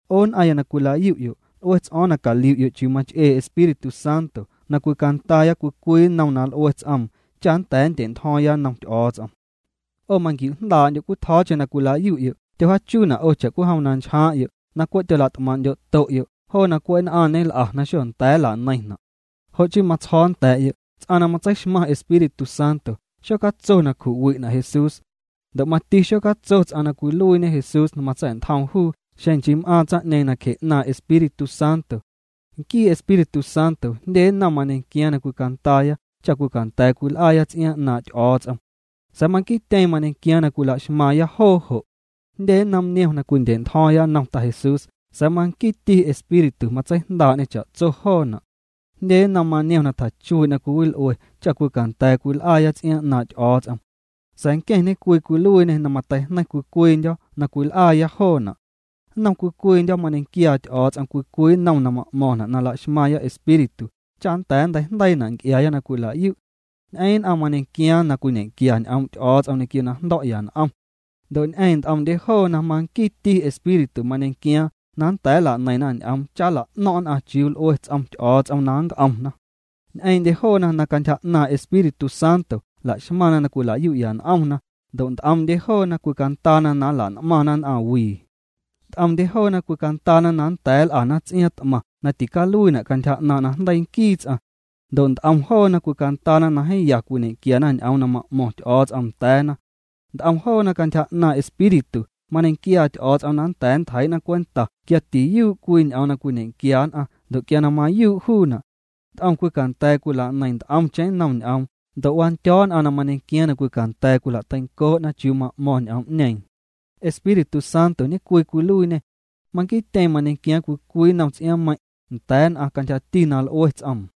'O nn'aⁿya na cwila'yu'yo', l'ue ts'o̱o̱ⁿ na caliu'yo' chiuu mach'ee Espíritu Santo na cwicandaaya cwii cwii nnom na l'ue ts'oom cha nnda̱a̱ nndya̱'ntjo̱o̱ⁿya nnom Ty'o̱o̱ts'om. 'O manquiu'jndaa'ndyo' cwitjo̱o̱cheⁿ na cwila'yu'yo', tyojaachuuna' 'o cha'cwijom na nchjaaⁿ'yo' na cwe' tyola't'maaⁿ'ndyo'to'yo' joo na cwe' nn'aⁿ ñel'a na xonda̱a̱ nla'neiⁿna'. Jo' chii matsjo̱o̱ nda̱a̱'yo', ts'aⁿ na matseixmaⁿ Espíritu Santo, xocatso na cju'wi'na' Jesús. Ndo' mati xocatso ts'aⁿ na cwiluiiñe Jesús na matsa̱'ntjoom juu xeⁿ nchii m'aaⁿ tsaⁿ'ñeeⁿ nacje 'naaⁿ' Espíritu Santo. Nquii Espíritu Santo jndye nnom mañequiaaⁿ na cwicandaaya cha cwicanda̱a̱ cwil'aaya ts'iaaⁿ 'naaⁿ' Ty'o̱o̱ts'om. Sa̱a̱ manquiityeeⁿ mañequiaaⁿ na cwilaxmaaⁿya joo jo'. Jndye nnom niom na cwindya̱'ntjo̱o̱ⁿya nnom Ta Jesús, sa̱a̱ manquiiti Espíritu matseijndaa'ñê cha'tso joona'. Jndye nnom maniom na tjachuii' na cwiwil'ue cha cwicanda̱a̱ cwil'aaya ts'iaaⁿ 'naaⁿ' Ty'o̱o̱ts'om. Sa̱a̱ nqueⁿ ñe'cwii cwiluiiñê na mateijneiⁿ cwii cwiindyo̱ na cwil'aaya joona'. Nnom cwii cwiindyo̱ mañequiaa Ty'o̱o̱ts'om cwii nnom na ma'mo̱ⁿna' na laxmaaⁿya Espíritu cha nntei'jndeiina' nnc'iaaya na cwila'yu'. Ñ'eeⁿ nn'aⁿ na mañequiaaⁿ na cwiñe'quia ñ'oom' Ty'o̱o̱ts'om ñequio na jndo̱'ya n'om. Ndo' ñ'eeⁿ nt'omndye joona manquiiti Espíritu mañequiaaⁿ na nnda̱a̱ nla'neiⁿna ñ'oom cha nla'no̱ⁿ' nn'aⁿ chiuu l'ue ts'om Ty'o̱o̱ts'om na nnc'omna. Ñ'eeⁿndye joona na cantyja 'naaⁿ' Espíritu Santo la'xmaⁿna na cwila'yu'ya n'omna, ndo' nt'omndye joona cwicandaana na nla'n'maⁿna nn'aⁿwii. Nt'omndye joona cwicandaana na nnda̱a̱ nl'ana ts'iaaⁿ t'maⁿ na ticaluiina' cantyja 'naaⁿ' najndeii nquii ts'aⁿ. Ndo' nt'om joona cwicandaana na jeeⁿ ya cwiñequiana ñ'oom na ma'mo̱ⁿ Ty'o̱o̱ts'om nda̱a̱na. Nt'om joona cantyja 'naaⁿ' Espíritu mañequiaa Ty'o̱o̱ts'om na nnda̱a̱ ntjeii'na cwenta quia tiyuu' cwii ñ'oom na cwiñequia nn'aⁿ ndo' quia na mayuu' juuna'. Nt'om cwicanda̱a̱ cwila'neiⁿ nt'omcheⁿ nnom ñ'oom ndo' wandyo̱o̱' nn'aⁿ na mañequiaaⁿ na cwicanda̱a̱ cwila'teincoo'na chiuu ma'mo̱ⁿ ñ'oom'ñeeⁿ. Espíritu Santo ñecwii cwiluiiñê. Manquiityeeⁿ mañequiaaⁿ cwii cwii nnom ts'iaaⁿmeiⁿ' nda̱a̱ nn'aⁿ cantyjati na l'ue ts'oom.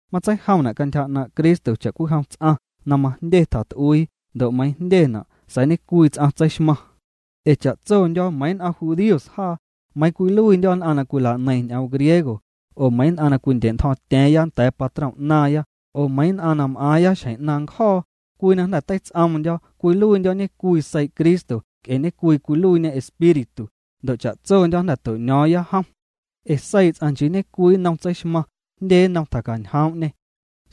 Matseijomna' cantyja 'naaⁿ' Cristo cha'cwijom ts'aⁿ na majndye tjat'uii' ndo' meiiⁿ jndyena' sa̱a̱ ñecwii ts'aⁿ tseixmaⁿ. Ee cha'tsondyo̱ meiiⁿ nn'aⁿ judíos jaa, meiiⁿ cwiluiindyo̱ nn'aⁿ na cwila'neiⁿ ñ'oom griego, oo meiiⁿ nn'aⁿ na cwindya̱'ntjo̱o̱ⁿtya̱a̱ⁿya nda̱a̱ patrom 'naaⁿya, oo meiiⁿ nn'aⁿ na m'aaⁿya xjeⁿ 'naaⁿ ncjo̱o̱, cwii na jnda̱ teits'oomndyo̱ cwiluiindyo̱ ñecwii seii' Cristo nc'e ñecwii cwiluiiñe Espíritu, ndo' cha'tsondyo̱ jnda̱ to'ño̱o̱ⁿya jom. Ee seii' ts'aⁿ nchii ñe'cwii nnom tseixmaⁿ, jndye nnom tjacañjoom'ñê.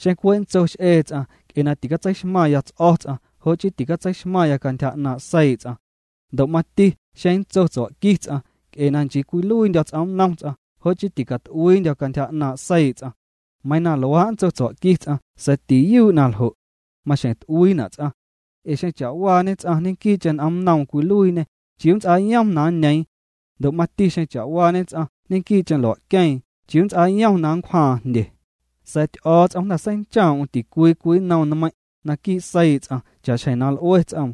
Xeⁿ cwe' nntso x'ee ts'aⁿ: “Nc'e na titseixmaⁿya ts'o̱ ts'aⁿ jo' chii ticatseixmaⁿya cantyja 'naaⁿ' seii' ts'aⁿ.” Ndo' mati xeⁿ nntso tsua'qui ts'aⁿ: “Nc'e na nchii cwiluiindyo̱ ts'omnnom ts'aⁿ, jo' chii ticat'uiindyo̱ cantyja 'naaⁿ' seii' ts'aⁿ.” Meiiⁿ na luaa' nntso tsua'qui ts'aⁿ, sa̱a̱ tiyuu' na ljo'. Maxjeⁿ t'uii'na' ts'aⁿ. Ee xeⁿ cha'waañe ts'aⁿ ñequii'cheⁿ n'omnnoom cwiluiiñê, ¿chiuu nnts'aayom na nñeeⁿ? Ndo' mati xeⁿ cha'waañe ts'aⁿ ñequii'cheⁿ lua'queeⁿ, ¿chiuu nnts'aayom na nncwjaaⁿ jndye? Sa̱a̱ Ty'o̱o̱ts'om jnda̱ seinchoom'm ticwii cwii nnom nmeiⁿ' naquii' seii' ts'aⁿ cha'xjeⁿ na l'ue ts'oom.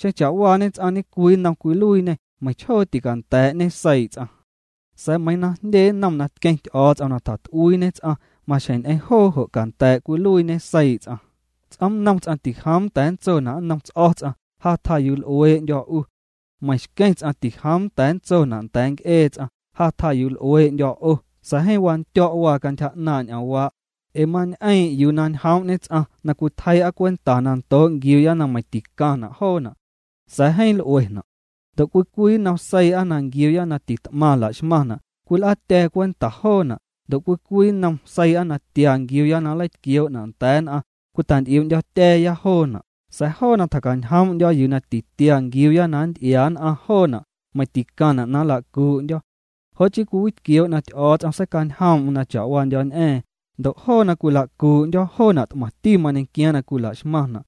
Xeⁿ cha'waañe ts'aⁿ ñe'cwii nnom cwiluiiñê, meiⁿchjoo ticanda̱a̱'ñe seii' ts'aⁿ. Sa̱a̱ meiiⁿ na jndye nnom na tqueⁿ Ty'o̱o̱ts'om na tjacat'uiiñe ts'aⁿ, maxjeⁿ ñ'eⁿ joo jo' canda̱a̱' cwiluiiñe seii' ts'aⁿ. Ts'omnnom ts'aⁿ tijoom nnda̱a̱ nntsona' nnom ts'o̱ ts'aⁿ: “Ja tjaa yuu l'uee'ndyo̱ 'u.” Meiⁿ xqueⁿ ts'aⁿ tijoom nnda̱a̱ nntsona' nda̱a̱ nc'ee ts'aⁿ: “Ja tjaa yuu l'uee'ndyo̱ 'o.” Sa̱a̱ jeeⁿ wandyo̱' waa cantyja 'naaⁿ' ñ'oomwaa'. Ee mañ'eeⁿ' yuu na ñjoom'ñe ts'aⁿ na cwitjeii'a cwenta na ndoo' nquiuuya na meiⁿ ticaⁿna' joona'. Sa̱a̱ jeeⁿ l'uena'. Ndo' cwii cwii nnom seii'a na nquiuya na tit'maⁿ la'xmaⁿna', cwil'aatya̱a̱ cwenta joona', ndo' cwii cwii nnom seii'a na tia nquiuuya na nleitquioo'na' nda̱a̱ nn'aⁿ, cwita'nty'iuu'ndyo̱tya̱a̱ joona' sa̱a̱ joo na tjacañjoom'ndyo̱ yuu na titia nquiuuya na nnty'iaa nn'aⁿ joona' meiⁿ ticaⁿna' na nla'cuu'ndyo̱. Jo' chii cwiwitquioo' na Ty'o̱o̱ts'om seicañjoom'm cha'waandyo̱ñ'a̱a̱ⁿ, ndo' joo na cwila'cuu'ndyo̱, joona' t'maⁿti mañequiaaⁿ na cwila'xmaⁿna'.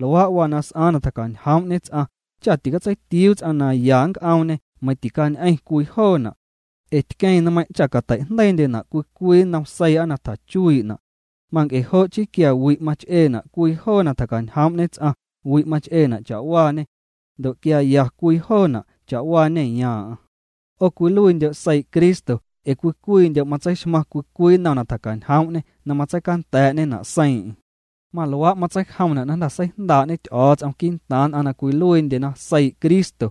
Luaa' waa na s'aaⁿ na tjacañjoom'ñe ts'aⁿ cha ticatseitiuu ts'aⁿ na ya nnc'oomñe meiiⁿ ticañ'eⁿ cwii joona'. Ee tqueeⁿ nmeiⁿ' cha catei'jndeiindyena' cwii cwii nnom seii'a na tjachuii'na'. Manc'e jo' chii quia wi' mach'eena' cwii joo na tjacañjoom'ñe ts'aⁿ, wi' mach'eena' cha'waañê. Ndo' quia ya cwii joona', cha'waañê yaaⁿ'aⁿ. 'O cwiluiindyo' seii' Cristo, ee cwii cwiindyo' matseixmaⁿ cwii cwii na tjacañjoom'ñê na matseicanda̱a̱'ñena' seiiⁿ'eⁿ. Maluaa' matseijomna' na jnda̱ seijndaa'ñe Ty'o̱o̱ts'om quii'ntaaⁿ nn'aⁿ na cwiluiindyena seii' Cristo.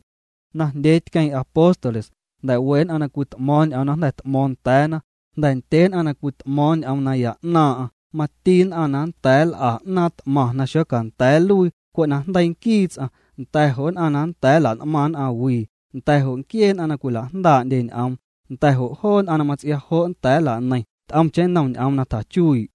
Najndyee tqueⁿ apóstoles, nda̱ we nn'aⁿ na cwit'mo̱o̱ⁿ ñ'oom na jnda̱ t'mo̱o̱ⁿ nda̱a̱na, jnda̱ ndyee nn'aⁿ na cwit'mo̱o̱ⁿ ñ'oom naya 'naaⁿ'aⁿ, mati nn'aⁿ na nnda̱a̱ nl'a 'naaⁿ t'maⁿ na xocanda̱a̱ nluiina' cwe' najndeii nquii ts'aⁿ, nda̱ jo' nn'aⁿ na nnda̱a̱ nla'n'maⁿna nn'aⁿwii, nda̱ jo' nquiee na cwila'jndaa'ndye ñ'oom, nda̱ jo' joo nn'aⁿ na mats'ia jo' nnda̱a̱ nla'neiⁿna nt'omcheⁿ nnom ñ'oom na tjachuii'.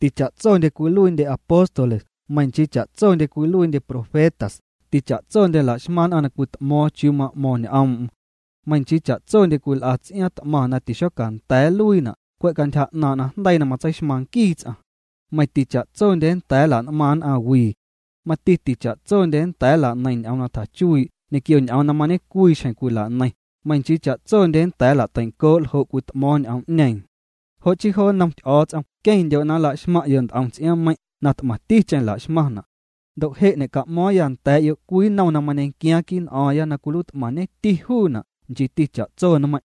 Ticha'tsondye cwiluiindye apóstoles, meiⁿ nchii cha'tsondye cwiluiindye profetas. Ticha'tsondye laxmaⁿ nn'aⁿ na cwit'mo̱o̱ⁿ chiuu ma'mo̱ⁿ ñ'oom'm. Meiⁿ nchii cha'tsondye cwil'a ts'iaaⁿ t'maⁿ na tixocanda̱a̱ nluiina' cwe' cantyja 'naaⁿ' najndeii na matseixmaⁿ nquii ts'aⁿ. Meiⁿ ticha'tsondye nnda̱a̱ nla'n'maⁿ nn'aⁿwii. Mati ticha'tsondye nnda̱a̱ nla'neiⁿ ñ'oom na tjachuii' ñequio ñ'oom na macwixjeⁿ cwila'neiⁿ, meiⁿ nchii cha'tsondye nnda̱a̱ nla'teincoo' ljo' cwit'mo̱o̱ⁿ ñ'oom'ñeeⁿ. Jo' chii jo nnom Ty'o̱o̱ts'om queⁿndyo' na nla'xmaⁿ'yo' nt'om ts'iaaⁿmeiⁿ' na t'maⁿticheⁿ la'xmaⁿna'. Ndo' je' ñeca'mo̱o̱ⁿya nda̱a̱'yo' cwii nnom na mañequiaaⁿ quii' n'o̱o̱ⁿya na cwiluiit'maⁿñeti juuna', nchiiti cha'tso nmeiⁿ'.